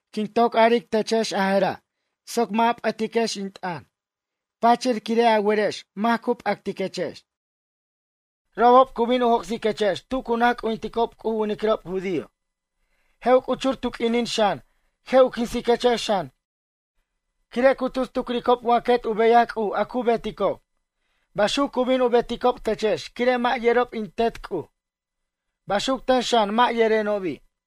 ’Quin toc aric techex a jera' soc mʌ' a p'ʌtiquex in t'ʌn pachir quire' a werex mac cu p'actiquex. Robob cu bin u joc'siquechex tu cu naj c'ujinticob C'uj u winiquirob judío. Je' u c'uchur tu q'uinin xan je' u quinsiquechex xan quire' cu tus tucricob wa quet u beyaj C'uj a cu beticob. Baxuc cu bin u beticob techex quire' mʌ' yerob in Tet C'uj. Baxuc ten xan mʌ' yerenobi'.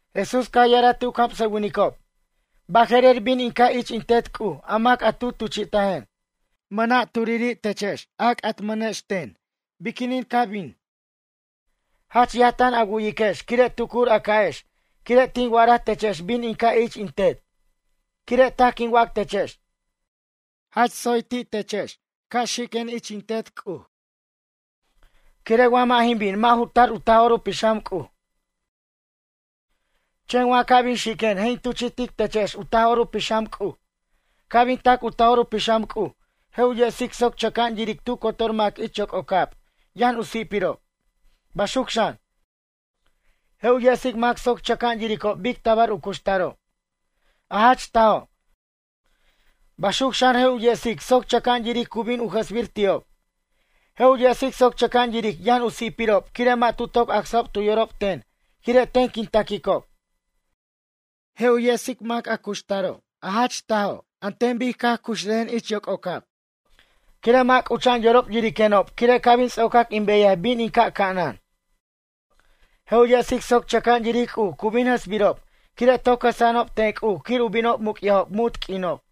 Jesús caj ya'araj ti' u camsʌwinicob. Baje'rer bin in ca' ich in Tet C'uj a mac tu tuchi'tajen. Mʌna' turiri' techex a c'atmʌnex ten biquinin ca bin. Jach yaj tan a wu'yiquex quire' tucur a ca'ex quire' tin wa'araj techex bin in ca' ich in Tet. Quire' taj quin wac techex. Jach tsoy ti' techex ca' xiquen ich in Tet C'uj. Quire' wa mʌ' jin bin mʌ' ju tar u Taj'or u Pixam C'uj. Chen wa ca' bin xiquen je' in tuchi'tic techex u Taj'or u Pixam C'uj. Ca' bin tac u Taj'or u Pixam C'uj je' u yesic soc chʌca'an yiric tu cotor mac ich yoc'ocab yʌn u si'pirob. Baxuc xan, je' u yesic mac soc chʌca'an yiricob bic tabar u cuxtaro', a jach tajo'. Baxuc xan je' u yesic soc chʌca'an yiric cu bin u jʌsbir ti'ob. Je' u yesic soc chʌca'an yiric yʌn u si'pirob quire' mʌ' tu toc acsajob tu yorob ten quire' ten quin taquicob. Je' u yesic mac a cuxtaro' a jach tajo' an ten bic caj cuxrajen ich yoc'ocab quire' mʌ' c'ucha'an yorob yiriquenob quire' ca' bin ts'ocac in beyaj bin in ca' ca'anan. Je' u yesic soc chʌca'an yiric C'uj cu bin jʌsbirob quire' toc jʌsa'anob ten C'uj quir u binob muc'yajob munt q'uinob.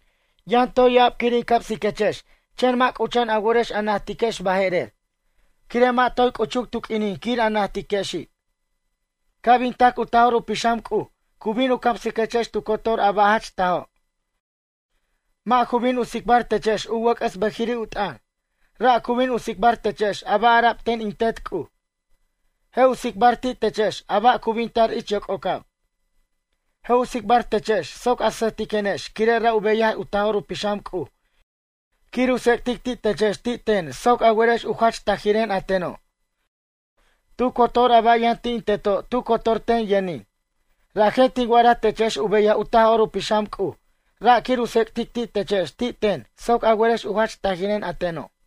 ’Yʌn toy ya'ab quir in camsiquechex chen mʌ' c'ucha'an a worex a najtiquex baje'rer. Quire' mʌ' toy c'uchuc tu q'uinin quir a najtiquexi'. Ca' bin tac u Taj'or u Pixam C'uj cu bin u camsiquechex tu cotor a ba' jach tajo'. Mʌ' ju bin u tsicbar techex u wʌc'ʌs bʌjiri' u t'ʌn. Ra' cu bin u tsicbar techex a ba' ara'b ten in Tet C'uj. Je' u tsicbar ti' techex a ba' cu bin tar ich yoc'ocab. Je' u tsicbar techex soc a sʌjtiquenex quire' ra' u beyaj u Taj'or u Pixam C'uj quir u tsec'tic ti' techex ti' ten soc a werex u jach tajiren a teno'. Tu cotor a ba' yʌn ti' in Teto' tu cotor ten yʌnin. Rajen tin wa'araj techex u beyaj u Taj'or u Pixam C'uj ra' quir u tsec'tic ti' techex ti' ten soc a werex u jach tajiren a teno'.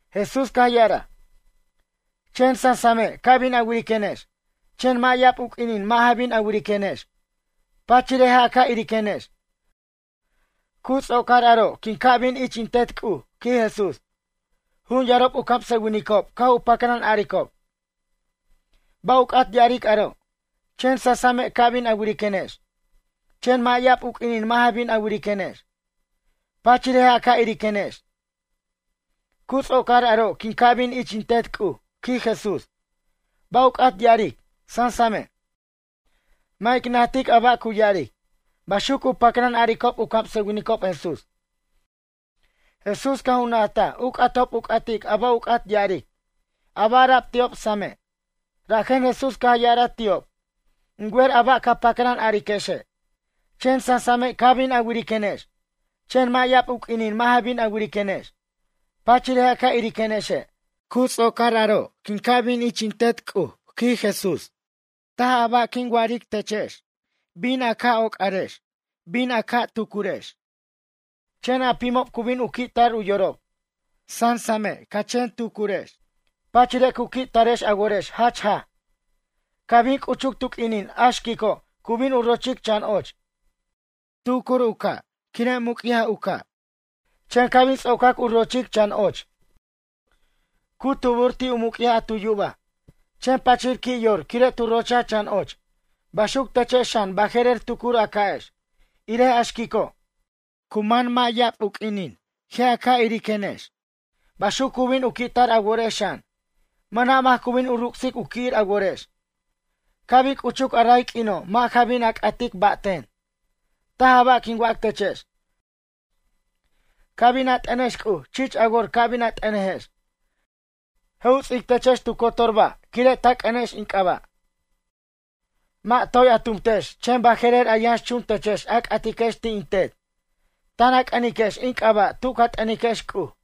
Jesús caj ya'araj: ―Chen sasame' ca bin a wiriquenex. Chen mʌ' ya'ab u q'uinin mʌ' ja bin a wiriquenex. Pachire' je' a ca' iriquenex. Cu ts'ocar aro' quin ca' bin ich in Tet C'uj ―quij Jesús. Jun yarob u camsʌwinicob caj u pacran aricob: ―Ba' u c'at ya'aric aro'?: “Chen sasame' ca bin a wiriquenex. Chen mʌ' ya'ab u q'uinin mʌ' ja bin a wiriquenex. Pachire' je' a ca' iriquenex. Cu ts'ocar aro' quin ca' bin ich in Tet C'uj”, quij Jesús. Ba' u c'at ya'aric: Sansame'? Mʌ' ic najtic a ba' cu ya'aric ―baxuc cu pacran a'aricob u camsʌwinicob Jesús. Jesús caj u najtaj u c'atob u c'atic a ba' u c'at ya'aric, a ba' ara'b ti'ob same'. Rajen Jesús caj ya'araj ti'ob: ―In wer a ba' ca pacran ariquexe'. Chen sasame' ca bin a wiriquenex. Chen mʌ' ya'ab u q'uinin mʌ' ja bin a wiriquenex. Pachire' je' a ca' iriquenexe'. Cu ts'ocar aro' quin ca' bin ich in Tet C'uj ―quij Jesús―. Taj a ba' quin wa'aric techex. Ca bin a woc'arex, ca bin a tucurex. Chen a pimob cu bin u qui' tar u yorob. Sansame' ca chen tucurex. Pachire' cu qui' tarex a worex jach jaj. Ca' bin c'uchuc tu q'uinin a xquico' cu bin u rochic chan och. Tucur u ca' quire' muc'yaj u ca', chen ca' bin ts'ocac u rochic chan och, cu tubur ti' u muc'yaj a tu yubaj. Chen pachir qui' yor quire' tu rochaj chan och. Baxuc techex xan baje'rer tucur a ca'ex, irej a xquico'. Cu man mʌ' ya'ab u q'uinin je' a ca' iriquenex. Baxuc cu bin u qui'tar a worex xan. Mʌna' mac cu bin u ruc'sic u qui'ir a worex. ’Ca' bin c'uchuc a ray q'uino' mʌ' ja bin a c'atic ba' ten. Taj a ba' quin wac techex. Ca' bin a t'ʌnex C'uj chich a wor ca' bin a t'ʌnejex. Je' u ts'ic techex tu cotor ba' quire' ta c'ʌnex in c'aba'. Mʌ' toy a tumtex chen baje'rer a yʌnx chun techex a c'atiquex ti' in Tet. Tan a c'ʌniquex in c'aba' tu ca t'ʌniquex C'uj.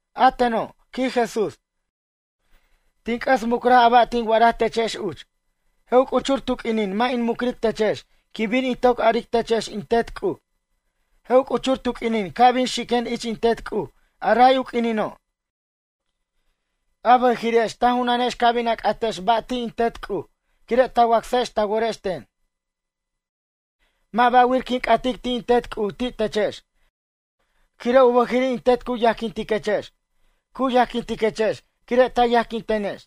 ’A teno' ―quij Jesús―, tin c'ʌs mucraj a ba' tin wa'araj techex uch. Je' u c'uchur tu q'uinin mʌ' in mucric techex quin bin in toc aric techex in Tet C'uj. Je' u c'uchur tu q'uinin ca' bin xiquen ich in Tet C'uj a ray u q'uinino'. A bʌjiri'ex ta junanex ca bin a c'atex ba' ti' in Tet C'uj quire' ta wacsex ta worex ten. Mʌ' ba'wir quin c'atic ti' in Tet C'uj ti' techex. Quire' u bʌjiri' in Tet cu yajquintiquechex. Cu yajquintiquechex quire' ta yajquintenex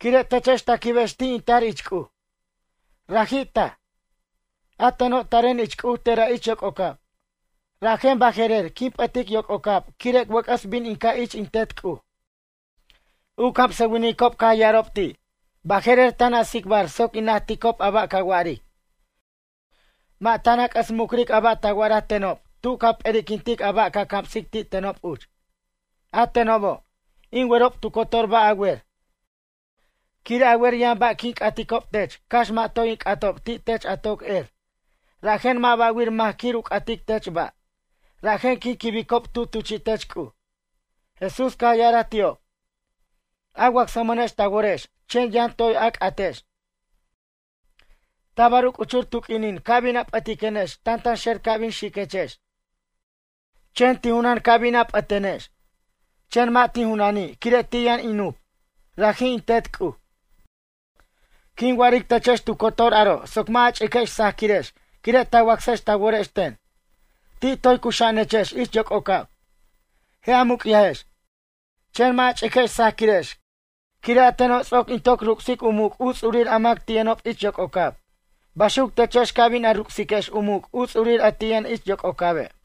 quire' techex ta quibex ti' in tar ich C'uj. Raji' taj, a teno' taren ich C'uj tera' ich yoc'ocab. Rajen baje'rer quin p'ʌtic yoc'ocab quire' wʌc'ʌs bin in ca' ich in Tet C'uj. U camsʌwinicob caj ya'arob ti': ―Baje'rer tan a tsicbar soc in najticob a ba' ca wa'aric. Mʌ' tan a c'ʌs mucric a ba' ta wa'araj tenob tu ca p'eri'quintic a ba' ca camsic ti' tenob uch. A tenobo', in werob tu cotor ba' a wer. Quire' a wer yʌn ba' quin c'aticob tech cax mʌ' toy in c'atob ti' tech a toc er. Rajen mʌ' ba'wir mac quir u c'atic tech ba'. Rajen quin quibicob tu tuchi'tech C'uj. Jesús caj ya'araj ti'ob: ―A wacsmʌnex ta worex chen yʌn toy a c'atex. Tabar u c'uchur tu q'uinin ca bin a p'ʌtiquenex tantanxer ca' bin xiquechex. Chen tin junan ca bin p'ʌtenex. Chen mʌ' tin junani' quire' ti' yʌn in nup, raji' in Tet C'uj. Quin wa'aric techex tu cotor aro' soc mʌ' a ch'iquex sajaquirex quire' ta wacsex ta worex ten. Ti' toy cuxa'anechex ich yoc'ocab, je' a muc'yajex. Chen mʌ' a ch'iquex sajaquirex quire' a teno' ts'oc in toc ruc'sic u muc' u ts'urir a mac ti' yʌnob ich yoc'ocab. Baxuc techex ca bin a ruc'siquex u muc' u ts'urir a ti' yʌn ich yoc'ocabe'.